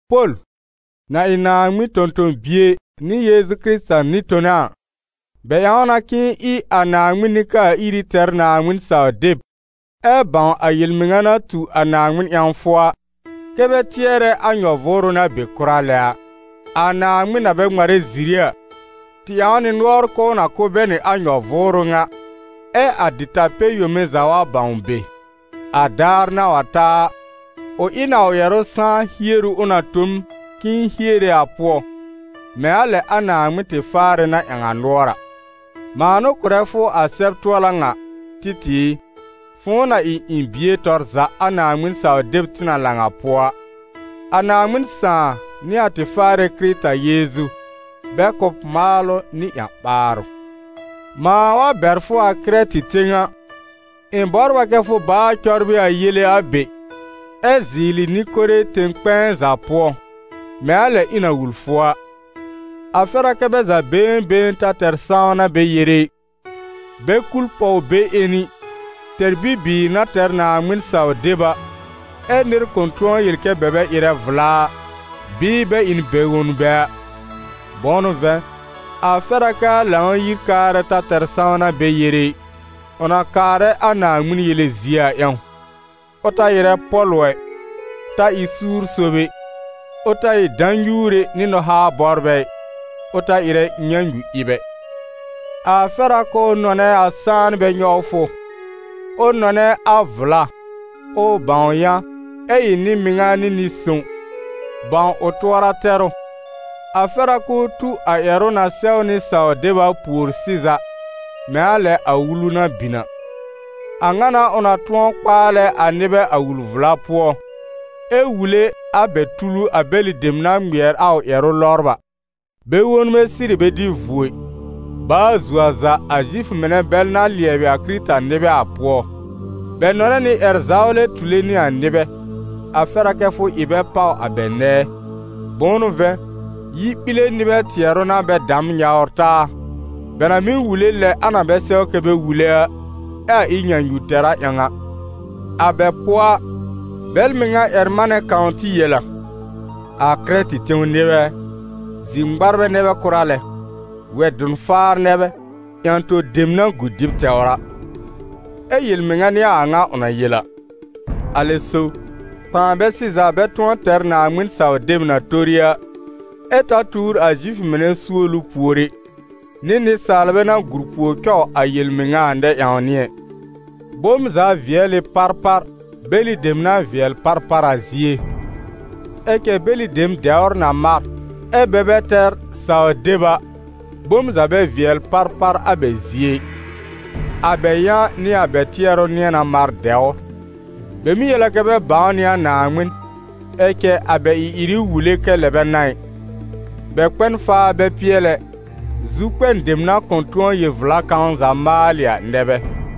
Pol, na ɩ Naaŋmɩn tõ-tõ-bie nɩ Yeezu nɩ-tona a, bɛ ƴãw na k'ɩ̃ɩ ɩ a Naaŋmɩn nɩ-kaa-iri tɛr Naaŋmɩn-saw-deb, ɛ bãw a yel-mɩŋa na tu a Naaŋmɩn ƴãwfʋ a, kɛ́ bɛ tɩɛrɛ a nyɔ-vʋʋrʋ na be kʋra lɛ a. A Naaŋmɩn na bɛ ŋmarɛ ziri a, tɩ ƴãw nɩ nʋɔr k'ʋʋ na kʋ̀ bɛ nɩ a nyɔ-vʋʋrʋ ŋa, ɛ a dɩta-pɛ-yome za wa bãw be. A daar na wa ta a, ʋ ɩ n a ʋ ƴɛrʋ sãá hieru ʋ na tõ m k'ɩ̃ɩ hiere a pʋɔ, mɛ̃ a lɛ a Naaŋmɩn tɩ Faarɛ na ƴãw a nʋɔr a. Mãa n'ʋ kʋrɛ fʋ a sɛb-tʋɔla ŋa, Títɩ̀ ɩ, fʋ̃ʋ na ɩ ɩ̃ bie tɔr za a Naaŋmɩn-saw-deb tɩ na lãw a pʋɔ a. A Naaŋmɩn Sãà nɩ a tɩ Faarɛ Kɩrɩta Yeezu, bɛ kʋ̀ b maalʋ nɩ ƴã-ɓaarʋ. Mãa wa bɛr fʋ a Kɩrɛtɩ tẽw a, ɩ̃ bɔbr a kɛ fʋ baa cɔbrɩ a yele a be, ɛ zɩɩlɩ nɩ-kore tẽw-kpɛ̃ɛ za pʋɔ, mɛ̃ a lɛ ɩ̃ na wul fʋ a. A fɛr a kɛ bɛ za been been ta tɛr sãwna bɛ yere ɩ, bɛ kul pɔw beƴẽni, tɛr bibiir na tɛr Naaŋmɩn-saw-deb a, ɛ́ nɩr kʋ̃ tʋ̃ɔ yel kɛ bɛ bɛ ɩrɛ vla a, bɩɩ bɛ ɩ n bɛ-wonbɛ a. Bʋ̃ʋ n'ʋ vɛ̃, a fɛr a k'aa Lãw-yir-kaarɛ ta tɛr sãwna bɛ yere ɩ, ʋ na kaarɛ a Naaŋmɩn yele zie a ƴãw: ʋ ta ɩrɛ pɔ̀lʋ ɛ, ta ɩ suur sob ɛ, ʋ ta ɩ dã-nyuure nɩ nɔ-haa-bɔbrɛ ɩ, ʋ ta ɩrɛ nyãnyu-ɩb ɛ. A fɛr a k'ʋʋ nɔnɛ a sãanbɛ nyɔwfʋ, ʋ nɔnɛ a vla, ʋ bãw yã, ɛ ɩ nɩ-mɩŋa nɩ nɩ-sõw, bãw ʋ tʋɔra tɛrʋ; a fɛr a k'ʋʋ tu a ƴɛrʋ na sɛwnɩ saw deb a pùor sɩza, mɛ̃ a lɛ a wulu na bin a. A ŋa n'a ʋ na tʋ̃ɔ kpaalɛ a nɩbɛ a wul-vla pʋɔ, ɛ wule a bɛ tulu a bɛlɩ dem na ŋmɩɛr a ʋ ƴɛrʋ lɔbr a. Bɛ-wonbɛ sɩrɩ bɛ dɩ vuo ɩ, baa zuo a za a Zifʋ mɩnɛ bɛl na lɩɛbɩ a Kɩrɩta-nɩbɛ a pʋɔ; bɛ nɔnɛ nɩ ƴɛr-zawlɛ tule nɩ a nɩbɛ. A fɛr a kɛ fʋ ɩ bɛ pàw a bɛ nɛɛ, bʋ̃ʋ n'ʋ vɛ̃, yi-ɓile nɩbɛ tɩɛrʋ n'a bɛ damn nyawr taa, bɛ na mɩ́ wule lɛ a na bɛ sɛw kɛ bɛ wule a, ɛ a ɩ nyãnyu-tɛra ƴãw a. A bɛ pʋɔ a, bɛl mɩŋa ƴɛr-manɛ kãw tɩ yel a: «A Kɩrɛtɩ tẽw nɩbɛ ɛ, zir-ŋmarbɛ nɛ bɛ kʋra lɛ, wɛ-dʋn-faar nɛ bɛ, yã-to dem na gu dɩb tɛwr a.» Ɛ́ yel-mɩŋa n'ɩ a a ŋa ʋ na yel a. Alɛ so, kpãa bɛ sɩza bɛ tʋ̃ɔ tɛr Naaŋmɩn-saw-deb na tori a, ɛ ta tuur a Zifʋ mɩnɛ suolu pùor ɛ, nɩ nɩsaalbɛ na gùr pùor cɔw a yel-mɩŋa a nɛ-ƴãwnɩ ɛ. Bom za vɩɛl ɩ parpar, bɛlɩ dem na vɩɛl parpar a zie. Ɛ cɛ bɛlɩ dem dɛwr na mar, ɛ́ bɛ bɛ tɛr saw-deb a, bom za bɛ vɩɛl parpar a bɛ zie ɩ, a bɛ yã nɩ a bɛ tɩɛrʋ nɩ̃ɛ na mar dɛwr. Bɛ mɩ́ yel a kɛ bɛ bãw nɩ a Naaŋmɩn, ɛ cɛ a bɛ ɩ-ɩrɩ wule kɛ lɛ bɛ n'a ɩ. Bɛ kpɛ n faa bɛ pɩɛl ɛ, zu-kpɛn dem na kʋ̃ tʋ̃ɔ yel-vla kãw za maalɩ a nɛ bɛ.